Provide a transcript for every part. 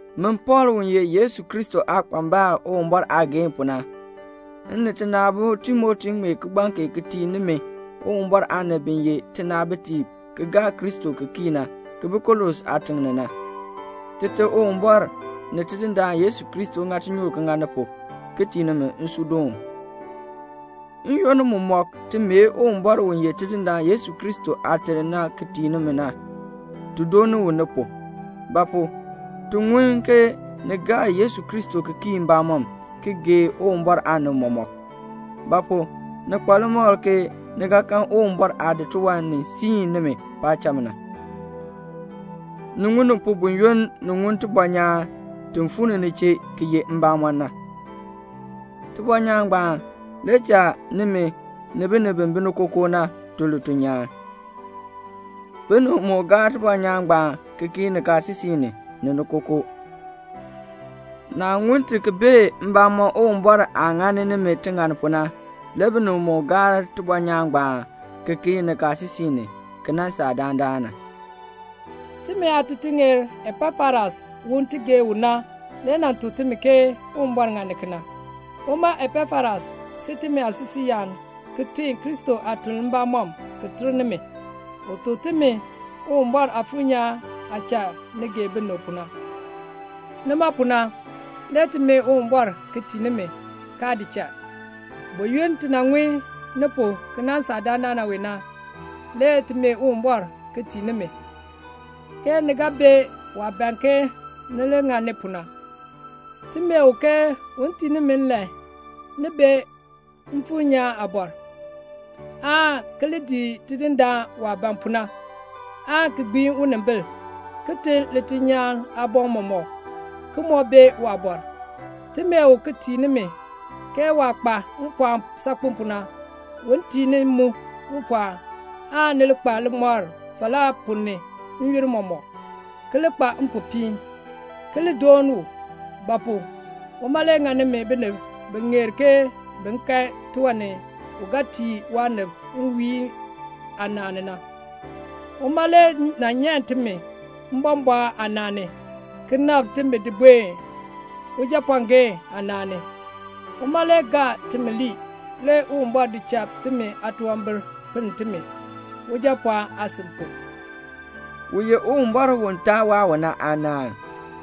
Min Pɔɔl u ye Yesu Kristo aakpambal Uwumbɔr aageehn pu na, m ni tina aabo Timoti ŋmee kigbaŋ kee ti tii nimi Uwumbɔr aanib bi ye tinaabitiib ki gaa Kristo ki kii na, ki bi Kolose aatiŋ ni na. Tite Uwumbɔr [ni Tidindaan Yesu Kristo] ŋa tinyoor ki ŋa ni pu, ki tii nimi nsuudoon. N-yoonn mumɔk ti mee Uwumbɔr u ye Tidindaan Yesu Kristo Aate na ki tii nimi na, ti dooni u ni pu; ba pu? ti ŋun ke ni gaa Yesu Kristo ki kii mbamɔm, ki gee Uwumbɔr aanib mɔmɔk; ba pu? ni kpa limakl ke ni ga kan Uwumbɔr aah di tiwan ni siin nimi paacham na. Ni ŋun ni pu buyoonn ni ŋun tibɔnyaan ti fuu ni ni chee ki ye mbamɔn na. Tibɔnyaan ngbaan le cha nimi ni binib bi bi ni kookoo na tun lituln nyaan. Binib moo gaar tibɔnyaan ngbaan ki kii nikaasisik ni, ni ni kookoo. Naah ŋun ti ki bee mbamɔm Uwumbɔr aah ŋani nimi tiŋann pu na, le binib moo gaar tibɔnyaan ngbaan ki kii nikaasisik ni, ki nan saa dandana. Timi aatutuŋeer Epafras u ti gee u na le nan tuk nimi ke Uwumbɔr ŋani kena. Uma Epafras si timi aasisiiyaan ki tun Kristo aatuln mbamɔm ki ter nimi. U tuk timi Uwumbɔr Aafuur nyaan aah cha ni gee binib pu na. Nima pu na le ti mee Uwumbɔr ki tii nimi, kaa di cha. Buyoonn ti nan ŋun ni pu ki nan saa dandana wee na, le ti mee Uwumbɔr ki tii nimi, ke ni ga bee waah ban ke ni li ŋani pu na. Ti mee u ke un tii nimi nlan ni bee Mfuur nyaan aabɔr, aan ki li dii Tidindaan waah ban pu na, aan ki gbiin unimbil, ki tun lituln nyaan aaboŋ mɔmɔk, ki moo bee waabɔr. Ti mee u ki tii nimi ke waah kpa mpɔɔn saakpen pu na un tii ni mu mpɔɔn, aan ni li kpa limɔr falaa ponn ni n-yoonn mɔmɔk, ki li kpa mpopiin, ki li dooni u; ba pu? uma le ŋa nimi binib bi ŋeer ke bin kan tiwan ni u ga tii waanib nwiihn aanaan ni na. Uma le nan nyan timi mbɔmbɔɔn aanaan ni, ki nabr timi di buen Ujapɔɔgeen aanaan ni. Uma le gaa timi lii, le Uwumbɔr di cha timi aatunwambir pinn timi, [Ujapɔɔn aasin pu]. U ye Uwumbɔr u taa waa u na aanaŋ,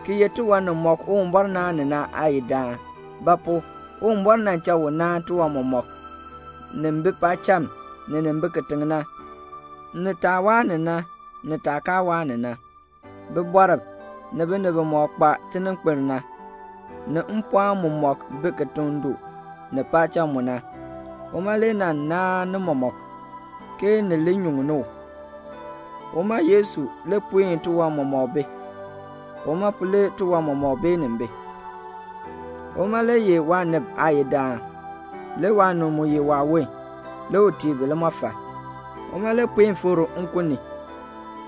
ki ye tiwan nimɔk Uwumbɔr naan ni na Aayidaan; ba pu? Uwumbɔr nan cha u naan tiwan mɔmɔk, nin bi paacham, ni nin bi kitiŋ na, ni taah waa ni na, ni taah kaa waa ni na; bibɔrb, ni binib bimɔk kpa tininkpil na, ni mpɔɔn mumɔk bi kitiŋ du, ni paacham mu na. Uma le nan naan ni mɔmɔk, ke ni li nyuŋni u. Uma Yesu le puen tiwan mɔmɔk bi. Uma pu le tiwan mɔmɔk beenin bi. Uma le ye waanib Aayidaan. Le waanib mu ye waawon, le u tii bi limɔfal. Uma le puen fikr nkun ni,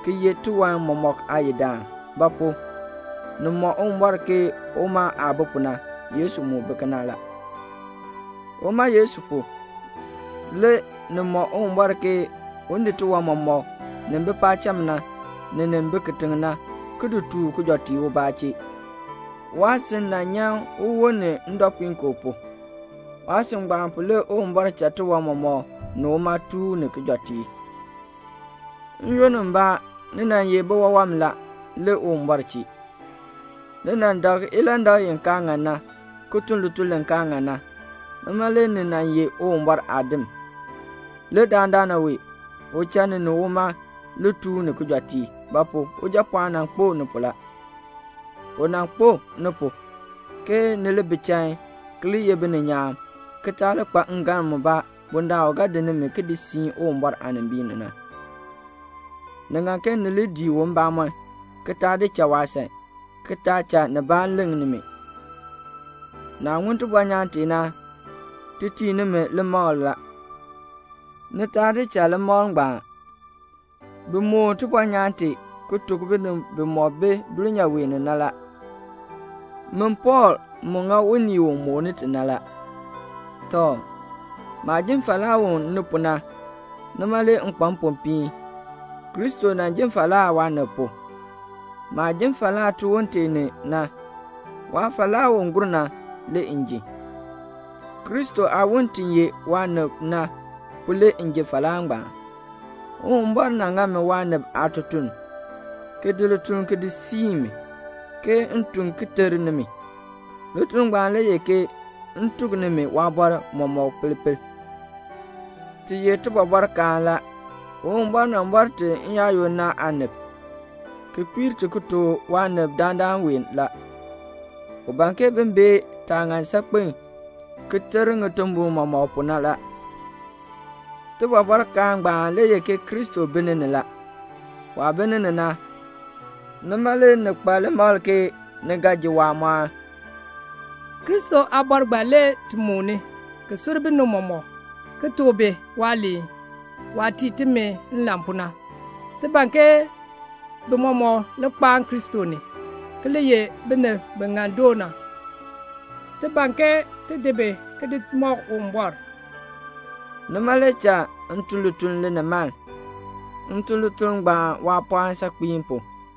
ki ye tiwan mɔmɔk Aayidaan; ba pu? ni mɔ Uwumbɔr ke uma aah bi pu na, Yesu mu bi kena la. Uma Yesu pu, le ni mɔ Uwumbɔr ke un di tiwan mɔmɔk, nin bi paacham na, ni nin bi kitiŋ na, ki di tooh kijɔteek ubaa chee. Waasin nan nyan uwon ni ndɔpuinkoo pu. Waasin ngbaan pu le Uwumbɔr cha tiwan mɔmɔk ni uma tooh ni kijɔteek. N-yoonn mbaa ni nan ye biwawam la, le Uwumbɔr chee. Ni nan dak ilandak i kaa ŋan na, ki tun lituln li kaa ŋan na, nima le ni nan ye Uwumbɔr aadim, le dandana wee u cha ni ni uma li tooh ni kijɔteek; ba pu? Ujapɔɔn nan kpo ni pu la. U nan kpo ni pu, ke ni li bi chain, ki li ye bininyaan, ki taa li kpa ngalm mubaa, bundaln u ga di nimi ki di siin Uwumbɔr aanimbiin ni na. Ni ŋan ke ni li dii u mbamɔm, ki taa di cha waasan, ki taa cha nibaa leŋ nimi. Naah ŋun tibɔnyaan tee na, ti tii nimi limakl la. Ni taa di cha limakl ngbaan. Bi moon tibɔnyaan tee, ki tuk binib bimɔk bi dulnyaa wee ni na la. Min Pɔɔl mu ŋa unii u mooni ti na la. Tɔ, maah ji falaa u ni pu na, nima le m kpa mpopiin. Kristo nan ji falaa waanib pu. Maah jin falaa tiwon tee ni na, waafalaa u gur na le m ji. Kristo aawon ti ye waanib na pu le m ji falaa ngbaan. Uwumbɔr nan ŋa mi waanib aatutuln, ki di lituln ki di siin mi, ke m tun ki ter nimi. Lituln ngbaan le ye ke m tuk nimi waabɔr mɔmɔk pel pel. Ti ye tibɔbɔrkaan la. Uwumbɔr nan bɔr ti n-yaayoonn na aanib, ki kpiir ti ki tuk waanib dandana wee la. U ban ke bin bee taah ŋan saakpen ki ter ŋitimbol mɔmɔk pu na la. Tibɔbɔrkaan ngbaan le ye ke Kristo bi ni ni la. Waah bi ni ni na, nima le ni kpa limakl ke ni ga ji waamɔɔn. Kristo aabɔr ngbaan le ti mooni, ki sur binib mɔmɔk, ki tuk bi waaliin, waah tii timi nlan pu na. Ti ban ke bi mɔmɔk li kpaan Kristo ni, ki li ye binib bi ŋan doo na. Ti ban ke ti di bi ki di mɔk Uwumbɔr. Nima le cha m tun lituln linimaln. M tun lituln ngbaan waapɔɔn saakpen pu.